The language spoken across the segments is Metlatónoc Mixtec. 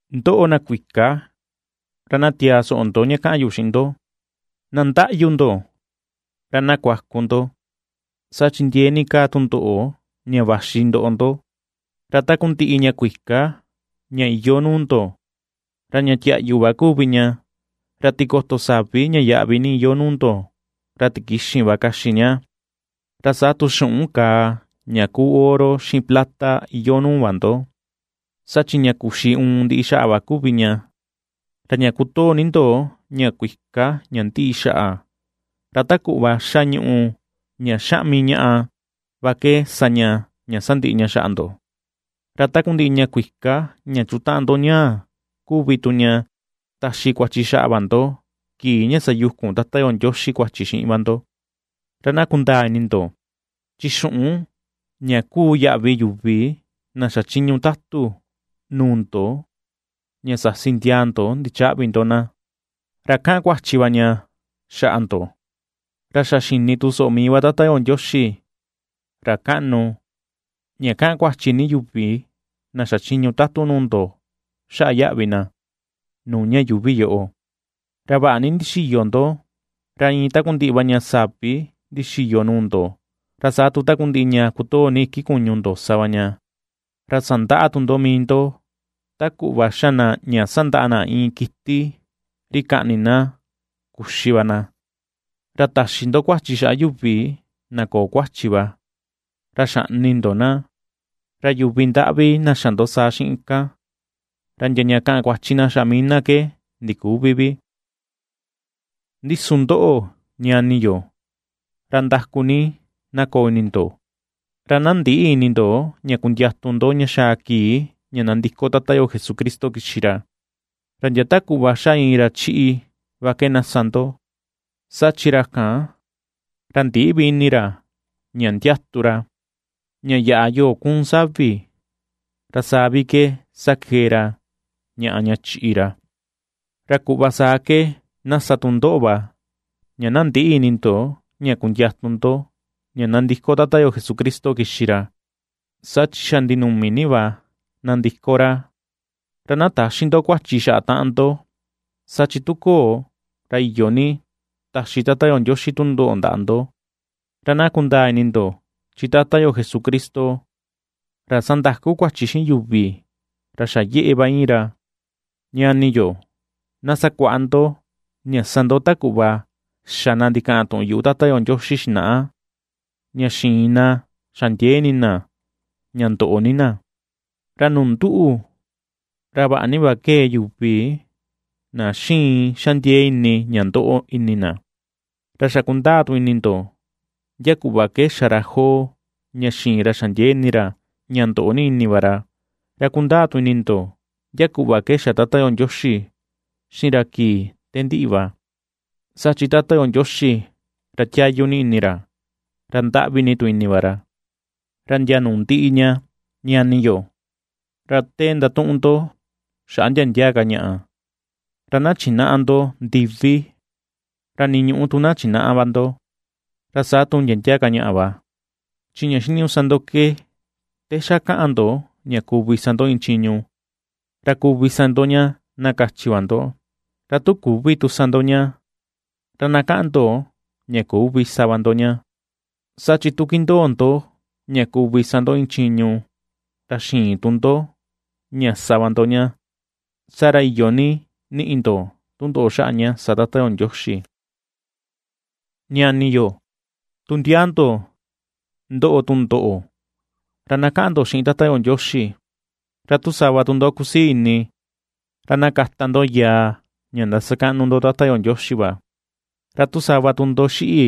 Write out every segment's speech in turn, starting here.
¡Ndoꞌo, na kuika! Ra na tiaa ni soꞌo ndo ña kaꞌan yu xiꞌin ndo. Na ndaꞌyu ndo, ra na kuaku ndo, saa chi ndiee ni kaa tundoꞌo ña vaxi ndoꞌo ndo. Ra takundiꞌi ña kuika ña iyoo nuu ndo, ra ña tiaꞌyu va kuvi ña, ra tikoto savi ña yaꞌvi ni iyoo nuu ndo, ra tikixin va kaxi ña. Ra saa tu xuꞌun kàà ña kuu oro xiꞌin plata iyoo nuu va ndo, saa chi ña kuxi uun ndiꞌi xaꞌa va kuvi ña, ra ña kutoo ni ndo ña kuika ña ndiꞌi xaꞌa, ra ta kuꞌva xa ñuꞌu ña xaꞌmi ñaꞌa va ke sa ña ña sandiꞌi ña xa ndo. Ra takundiꞌi ña kuika ña chutaꞌan ndo ñaa kuvi tu ña taxi kuachi xaꞌa va ndo kii ña sayukun Tata yo Ndioxi kuachi xiꞌin va ndo. Ra na kundaa ini ndo, chi xuꞌun, ña kuu yaꞌvi yuvi na xachiñu tatu nuu ndo ña sasi ndia ndo ndichäꞌvi ndo na, ra kaꞌan kuachi va ña xaꞌa ndo; ra xa xini tu soꞌo mii va Tata yo Ndioxi, ra kaꞌnu, ña kaꞌan kuachi ni yuvi na xachiñu tatu nuu ndo xaꞌa yaꞌvi na. Nuu ña yuuvi yoꞌo, ra vaꞌa ni ndixiyo ndo, ra iin takundiꞌi va ña savi ndixiyo nuu ndo, ra saa tu takundiꞌi ña kutoo ni iki kuñu ndo sa va ña; ra sandaꞌa tu ndo mii ndo, ta kuꞌva xa na ña sandaꞌa na iin kiti ri kaꞌni na kuxi va na. Ra taxi ndo kuachi xaꞌa yuvi na köo kuachi va, ra xaꞌni ndo na, ra yuvi ndaꞌvi na xa ndo saa xiꞌin kan, ra ndia ña kaꞌan kuachi na xaꞌa mii na ke ndiküvi vi. Ndi su ndoꞌo, ñani yo, ra ndaku ni na koo ini ndo, ra na ndïꞌi ini ndo ña kundiatu ndo ña xaa kii ña ndandiko Tata yo Jesucristo kixi ra. Ra ndia ta kuꞌva xa iin ra chiꞌi va ke na sa ndo, saa chi ra kan, ra ndïꞌi vi ini ña ndiatu ra, ña yaꞌa yoo kuun savi, ra saa vi ke sakee ra ñaꞌa ña chiꞌi ra. Ra kuꞌva saa ke na sa tu ndoꞌo va ña na ndïꞌi ini ndo ña kundiatu ndo ña nandiko Tata yo Jesucristo kixi ra, saa chi xa ndinuni ni va nandiko ra. Ra na täxi ndo kuachi xaꞌa taꞌan ndo, saa chi tu köo ra iyo ni taxi Tata yo Ndioxi tundoꞌo ndaꞌa ndo, ra na kundaa ini ndo, chi Tata yo Jesucristo, ra sandaku kuachi xiꞌin yuvi, ra xa yeꞌe va iin ra. Ñani yo, na sakuaꞌa ndo ña sa ndo ta kuꞌva xa na ndikaꞌan tuꞌun yuꞌu Tata yo Ndioxi xinaꞌa ña xiin na xa ndiee ini na ña ndoꞌo ni na. Ra nuu nduꞌu, ra vaꞌa ni va ^kee yuvi na xiin xa ndiee ini ña ndoꞌo ini na. Ra xa kundaa tu ini ndo ndia kuꞌva ke xa ra Job ña xiin ra xa ndiee ini ra ña ndoꞌo ni ini va ra, ra kundaa tu ini ndo ndia kuꞌva ke xa Tata yo Ndioxi xiꞌin ra te kii ndiꞌi va; saa chi Tata yo Ndioxi, ra tiayu ni ini ra, ra ndaꞌvi ni tu ini va ra. Ra ndia nuu ndiꞌi ña, ñani yo, ra te ndatuꞌun ndo xaꞌa ndia ndia ka ñaꞌa, ra na chinäꞌa ndo ndiví, ra ni ñuꞌu tu na chinäꞌa va ndo, ra saa tu ndia ndia ka ñaꞌa va. Chi ña xiniñuꞌu sa ndo ke te xa kaꞌan ndo ña kuvi sa ndo iin chiñu, ra kuvi sa ndo ña na kachi va ndo; ra tu küvi tu sa ndo ña, ra na kaꞌan ndo ña küvi sa va ndo ña; saa chi tu kindoo ndo ña kuvi sa ndo iin chiñu, ra xïin tu ndo ña sa va ndo ña, saa ra iyo ni niꞌi ndo tundoꞌo xaꞌa ña sa Tata yo Ndioxi. Ñani yo tu ndia ndo ndoꞌo tundoꞌo, ra na kaꞌan ndo xiꞌin Tata yo Ndioxi. Ra tu sava tu ndo kusii ini, ra na kata ndo yaa ña ndasakaꞌnu ndo Tata yo Ndioxi va. Ra tu sava tu ndo xiꞌi,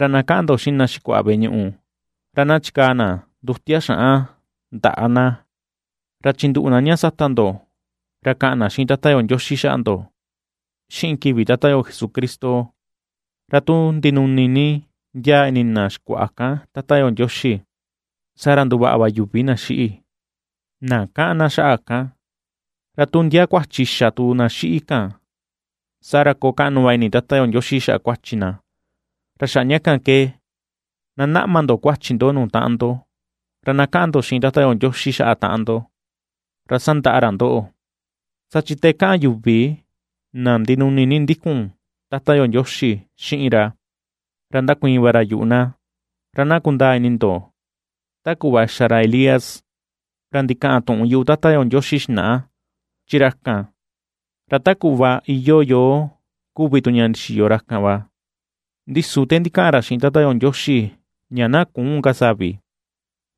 ra na kaꞌan ndo xiꞌin na xikuaꞌa veꞌe ñuꞌu, ra na chikaa na ndutia xaꞌan ndaꞌa na, ra chinduꞌu na ña sata ndo, ra kaꞌan na xiꞌin Tata yo Ndioxi xaꞌa ndo xiꞌin kivi Tata yo Jesucristo. Ra tu ndinuni ni ndiaa ini na xikuaꞌa kan Tata yo Ndioxi, saa ra nduvaꞌa va yuvi na xiꞌi, na kaꞌan na xaꞌa kan; ra tu ndia kuachi xa tu na xiꞌi kan, saa ra koo kaꞌnu va ini Tata yo Ndioxi xaꞌa kuachi na. Ra xaꞌa ña kan ke, na naꞌma ndo kuachi ndo nuu taꞌan ndo, ra na kaꞌan ndo xiꞌin Tata yo Ndioxi xaꞌa taꞌan ndo, ra sandaꞌa ra ndoꞌo. Saa chi te kaꞌan yuvi na ndinuni ni ndikun Tata yo Ndioxi xiꞌin ra, ra ndakuiin va ra yuꞌu na. Ra na kundaa ini ndo ta kuꞌva xa ra Elías, ra ndikaꞌan tuꞌun yuꞌu Tata yo Ndioxi xinaꞌa, chi ra kan, ra ta kuꞌva iyoo yoo kuvi tu ña ndixiyo tu ra kan va; ndi su te ndikaꞌan ra xiꞌin Tata yo Ndioxi ña na küun ka savi,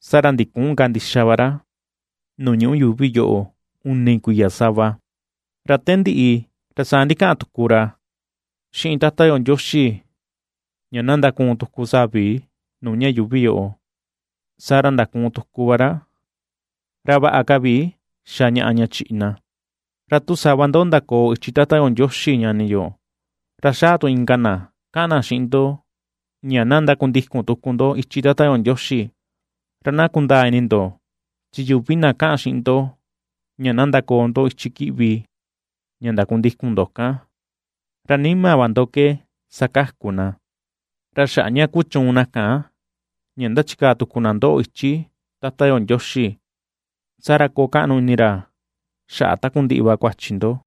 saa ra ndiküun ka ndixa va ra, nuu ñuꞌu yuuvi yoꞌo uni kuiya sava. Ra te ndiꞌi, ra saa ndikaꞌan tuku ra xiꞌin Tata yo Ndioxi ña na ndakuun tuku savi nuu ña yuuvi yoꞌo, saa ra ndakuun tuku va ra, ra vaꞌa ka vi xa ñaꞌa ña chiꞌi na. Ra tu sava ndo ndakoo ichi Tata yo Ndioxi ñani yo, ra xaa tu inka na kaꞌan na xiꞌin ndo ña na ndakundikun tuku ndo ichi Tata yo Ndioxi, ra na kundaa ini ndo, chi yuvi na kaꞌan xiꞌin ndo ña na ndakoo ndo ichi kiꞌvi ña ndakundikun ndo kan, ra nima va ndo ke sakaku na, ra xaꞌa ña kuchuun na kan ña ndachikaa tuku na ndoꞌo ichi Tata yo Ndioxi, saa ra koo kaꞌnu ini ra xaꞌa takundiꞌi va kuachi ndo.